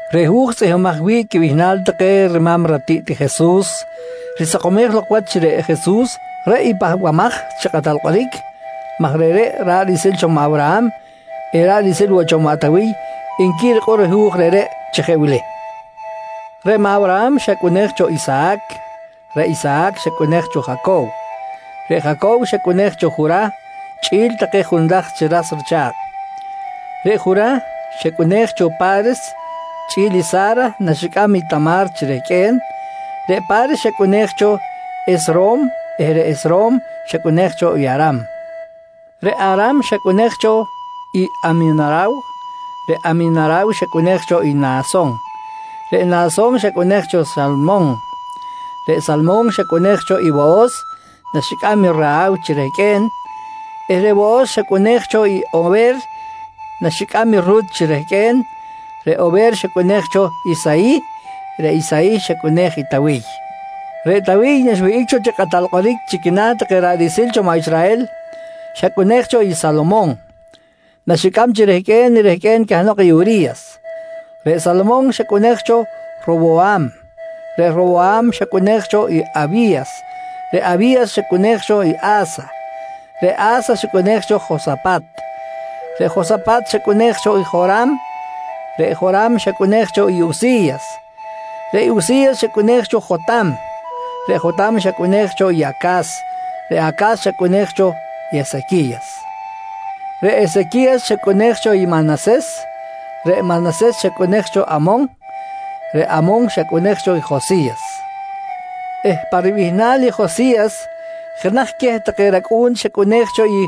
Reꞌ hu̱j tzꞌihmbimaj wi̱ꞌ quibihnal take rima̱m ratiꞌt i Jesus risakomej lok wach chi reꞌ Jesus, reꞌ i Pahbamaj chi Kꞌatal Kꞌoric maj reꞌreꞌ, ra̱ꞌ riꞌsil cho maꞌ Awraham eh ra̱ꞌ riꞌsil woꞌ cho maꞌ Tawiy nqui rikꞌor i hu̱j reꞌreꞌ chi jeꞌ wili: Reꞌ maꞌ Awraham xacꞌunej cho Isahac, reꞌ Isahac xacꞌunej cho Jacow, reꞌ Jacow xacꞌunej cho Jurah chꞌi̱l take junlaj chi ras richa̱kꞌ, reꞌ Jurah xacꞌunej cho i Pa̱res chꞌi̱l i Sa̱ra naxicꞌam i Tama̱r chi rehqꞌue̱n, reꞌ Pa̱res xacꞌunej cho Hesrom eh reꞌ Hesrom xacꞌunej cho i Aram. Reꞌ Aram xacꞌunej cho i Aminaraw, reꞌ Aminaraw xacꞌunej cho i Nahason, reꞌ Nahason xacꞌunej cho i Salmon, reꞌ Salmon xacꞌunej cho i Wohos naxicꞌam i Rahaw chi rehqꞌue̱n, eh reꞌ Wohos xacꞌunej cho i Ower naxicꞌam i Rut chi rehqꞌue̱n, reꞌ Ower xacꞌunej cho Isayih, reꞌ Isayih xacꞌunej i Tawiy. Reꞌ Tawiy naxwihꞌic cho chi kꞌatal kꞌoric chi quina̱ take ra̱ꞌ riꞌsil cho Israhel, xacꞌunej cho i Salomon naxicꞌam chi rehqꞌue̱n i rehqꞌue̱n cahnok i Uri̱yas. Reꞌ Salomon xacꞌunej cho Rowoham, reꞌ Rowoham xacꞌunej cho i Awi̱yas, reꞌ Awi̱yas xacꞌunej cho i A̱sa, reꞌ A̱sa xacꞌunej cho i Josapat, reꞌ Josapat xacꞌunej cho i Joram, reꞌ Joram xacꞌunej cho i Usi̱yas. Reꞌ Usi̱yas xacꞌunej cho Jotam, reꞌ Jotam xacꞌunej cho i Acas, reꞌ Acas xacꞌunej cho i Esequi̱yas, reꞌ Esequi̱yas xacꞌunej cho i Manases, reꞌ Manases xacꞌunej cho Amon, reꞌ Amon xacꞌunej cho Josi̱yas, eh pa ribihnal i Josi̱yas jenaj queh take racꞌu̱n xacꞌunej cho i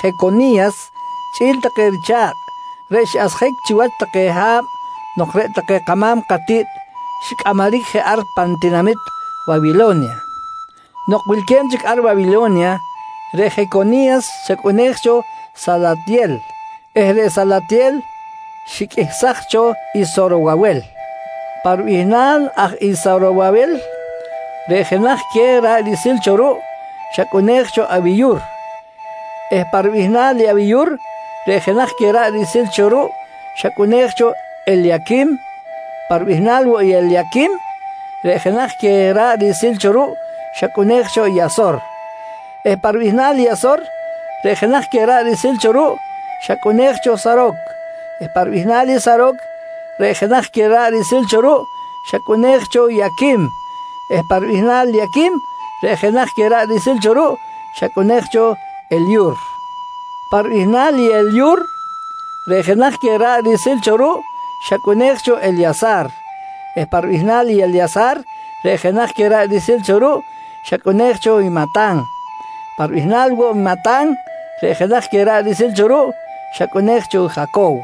Jeconi̱yas chꞌi̱l take richa̱kꞌ, reꞌ xiꞌasjic chiwach take ha̱b nok reꞌ take kama̱m katiꞌt xicꞌamaric je ar pan tinamit Wawilo̱nya. Nok wilque̱b chic ar Wawilo̱nya, reꞌ Jeconi̱yas xacꞌunej cho Salatyel eh reꞌ Salatyel xiqꞌuihsaj cho i Sorowawel. Pa ribihnal aj i Sorowawel reꞌ jeꞌ jenaj queh ra̱ꞌ riꞌsil cho ruꞌ xacꞌunej cho Awiyur, eh pa ribihnal i Awiyur, reꞌ jenaj queh ra̱ꞌ riꞌsil cho ruꞌ xacꞌunej cho Elyaquim. Pa ribihnal woꞌ i Elyaquim, reꞌ jenaj queh ra̱ꞌ riꞌsil cho ruꞌ xacꞌunej cho i Asor, eh pa ribihnal i Asor, reꞌ jenaj queh ra̱ꞌ riꞌsil cho ruꞌ xacꞌunej cho Saroc. Pa ribihnal i Saroc, reꞌ jenaj queh ra̱ꞌ riꞌsil cho ruꞌ xacꞌunej cho i Aquim, eh pa ribihnal i Aquim, reꞌ jenaj queh ra̱ꞌ riꞌsil cho ruꞌ xacꞌunej cho Elyur. Pa ribihnal i Elyur, reꞌ jenaj queh ra̱ꞌ riꞌsil cho ruꞌ xacꞌunej cho Elya̱sar, eh pa ribihnal i Elya̱sar reꞌ jenaj queh ra̱ꞌ riꞌsil cho ruꞌ xacꞌunej cho i Matan. Pa ribihnal woꞌ i Matan, reꞌ jenaj queh ra̱ꞌ riꞌsil cho ruꞌ xacꞌunej cho i Jacow,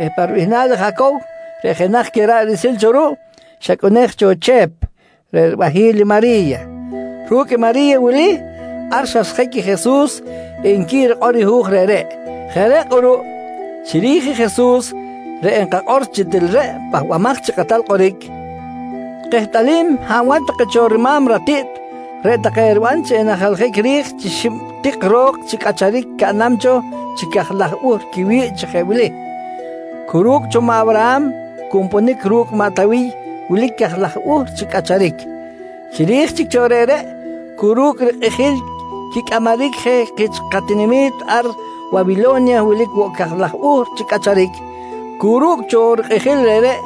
eh pa ribihnal i Jacow, reꞌ jenaj queh ra̱ꞌ riꞌsil cho ruꞌ xacꞌunej cho i Chep reꞌ ribahi̱l i Mari̱ya. Ru̱cꞌ i Mari̱ya wili, ar xasjic i Jesus, nqui rikꞌor i hu̱j reꞌreꞌ. Jeꞌ reꞌ kꞌuruꞌ, chiri̱j i Jesus reꞌ enkakꞌor chi til reꞌ i Pahbamaj chi Kꞌatal Kꞌoric, kehtꞌalim hab wach take cho rima̱m ratiꞌt, reꞌ take eriban chi enajlajic ri̱j chi xib tik ro̱k chi cꞌacharic caꞌnam cho chi cajlaj buhr quiwi̱ꞌ chi jeꞌ wili: Cu ru̱cꞌ cho maꞌ Awraham cu nponic ru̱cꞌ maꞌ Tawiy wilic cajlaj buhr chi cꞌacharic. Chiri̱j chic cho reꞌreꞌ, cu ru̱cꞌ rikꞌijil quicꞌamaric je kich katinami̱t ar Wawilo̱nya wilic woꞌ cajlaj buhr chi cꞌacharic. Cu ru̱cꞌ cho rikꞌijil reꞌreꞌ,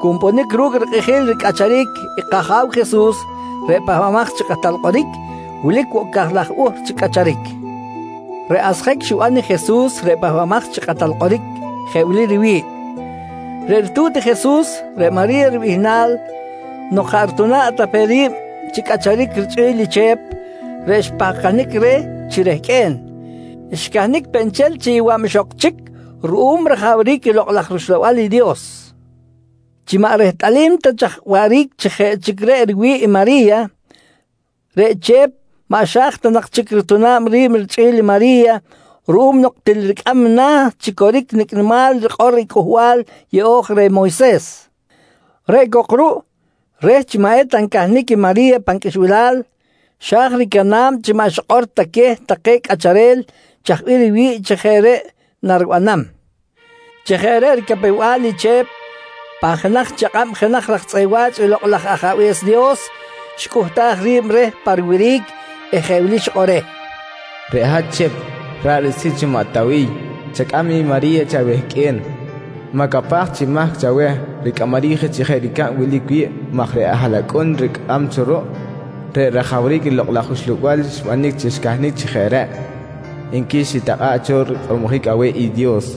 cu nponic ru̱cꞌ rikꞌijil ricꞌacharic kAja̱w Jesus, reꞌ Pahbamaj chi Kꞌatal Kꞌoric, wilic woꞌ cajlaj buhr chi cꞌacharic. Reꞌ asjic xiban i Jesus reꞌ Pahbamaj chi Kꞌatal Kꞌoric jeꞌ wili riwi̱ꞌ: Reꞌ ritu̱t i Jesus reꞌ Mari̱ya ribihnal, nok jaꞌ rituna̱ꞌ ta pe ri̱b chi cꞌacharic richꞌi̱l i Chep, reꞌ xpahkanic reh chi rehqꞌue̱n, xcahnic peꞌ nchel chi yowa̱b ixok chic ruꞌum rajawric i Lokꞌ laj rUxlabal i Dios. Chi maꞌ rehtꞌalim ta chaj waꞌric chi jeꞌ chic reꞌ riwi̱ꞌ i Mari̱ya, reꞌ Chep maꞌ xa̱j ta nak chic rituna̱b ri̱b richꞌi̱l i Mari̱ya ruꞌum nok til ricꞌam na̱ chi coric nicꞌ nimal rikꞌor i Cꞌuhbal Yeꞌo̱j reh Moyses. Reꞌ cok ruꞌ reh chi maꞌ eta ncahnic i Mari̱ya pan qꞌuixbilal, xa̱j ricana̱b chi maꞌ xikꞌor ta queh take cꞌacharel chaj bih riwi̱ꞌ chi jeꞌ reꞌ naribanam. Chi jeꞌ reꞌ ricapew-bal i Chep, pan jenaj chakꞌab jenaj raj tzꞌeꞌ wa̱ch i Lokꞌ laj Ajabe̱s Dios xicꞌuhtaj ri̱b reh pa riwiric eh jeꞌ wili xikꞌor reh: «Reꞌ hat Chep, ra̱ꞌ riꞌsil cho maꞌ Tawiy, chacꞌam i Mari̱ya chi awehqꞌue̱n. Ma̱capaj chi mahc chaweh ricꞌamaric chi jeꞌ ricab wilic wi̱ꞌ maj reꞌ haꞌlacꞌun rihkam cho ruꞌ, reꞌ rajawric i Lokꞌ laj Uxlabal xbanic chi xcahnic chi jeꞌ reꞌ, nqui xitakꞌa̱ꞌ cho rikꞌormojic aweh i Dios.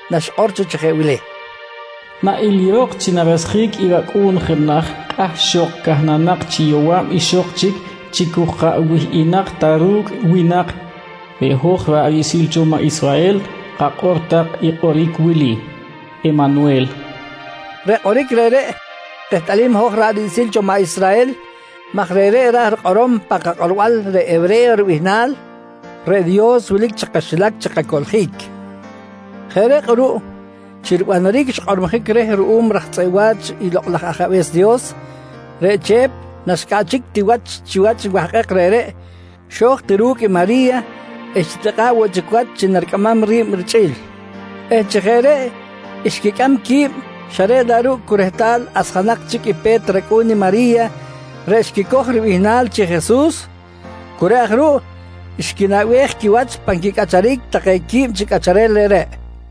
naxikꞌor cho chi jeꞌ wili: “Na ilirok chi narasjic i racꞌu̱n jenaj kꞌahxok cahnanak chi yowa̱b ixok chic chi cu jaꞌ wihꞌinak ta ru̱cꞌ winak, reꞌ hoj ra̱ꞌ riꞌsil cho maꞌ Israhel kakꞌor tak i kꞌoric wili: “Emanwel”, nqui Isayi̱yas. Reꞌ kꞌoric reꞌreꞌ kehtꞌalim i hoj ra̱ꞌ riꞌsil cho maꞌ Israhel maj reꞌreꞌ ra̱j rikꞌorom pan kakꞌorbal reꞌ hewre̱yo ribihnal: “Reꞌ Dios wilic chi kaxilac chi kacoꞌljic”. Jeꞌ reꞌ kꞌuruꞌ chi ribanaric xkꞌormojic reh ruꞌum raj tzꞌeꞌ wa̱ch i Lokꞌ laj Ajabe̱s Dios, reꞌ Chep naxcꞌaꞌchic ti wach chiwach i wahkꞌek reꞌreꞌ, xo̱j ti ru̱cꞌ i Mari̱ya eh xitikꞌa̱ꞌ woꞌ chic wach chi naricꞌamam ri̱b richꞌi̱l eh chi jeꞌ reꞌ xquicꞌam qui̱b, xa reꞌ laꞌ ruꞌ cu rehtal asjanak chic i pe̱t racꞌu̱n i Mari̱ya reꞌ xquicoj ribihnal chi Jesus, cu reꞌ aj ruꞌ xquinaꞌbej quiwach pan quicꞌacharic take qui̱b chi cꞌacharel reꞌreꞌ.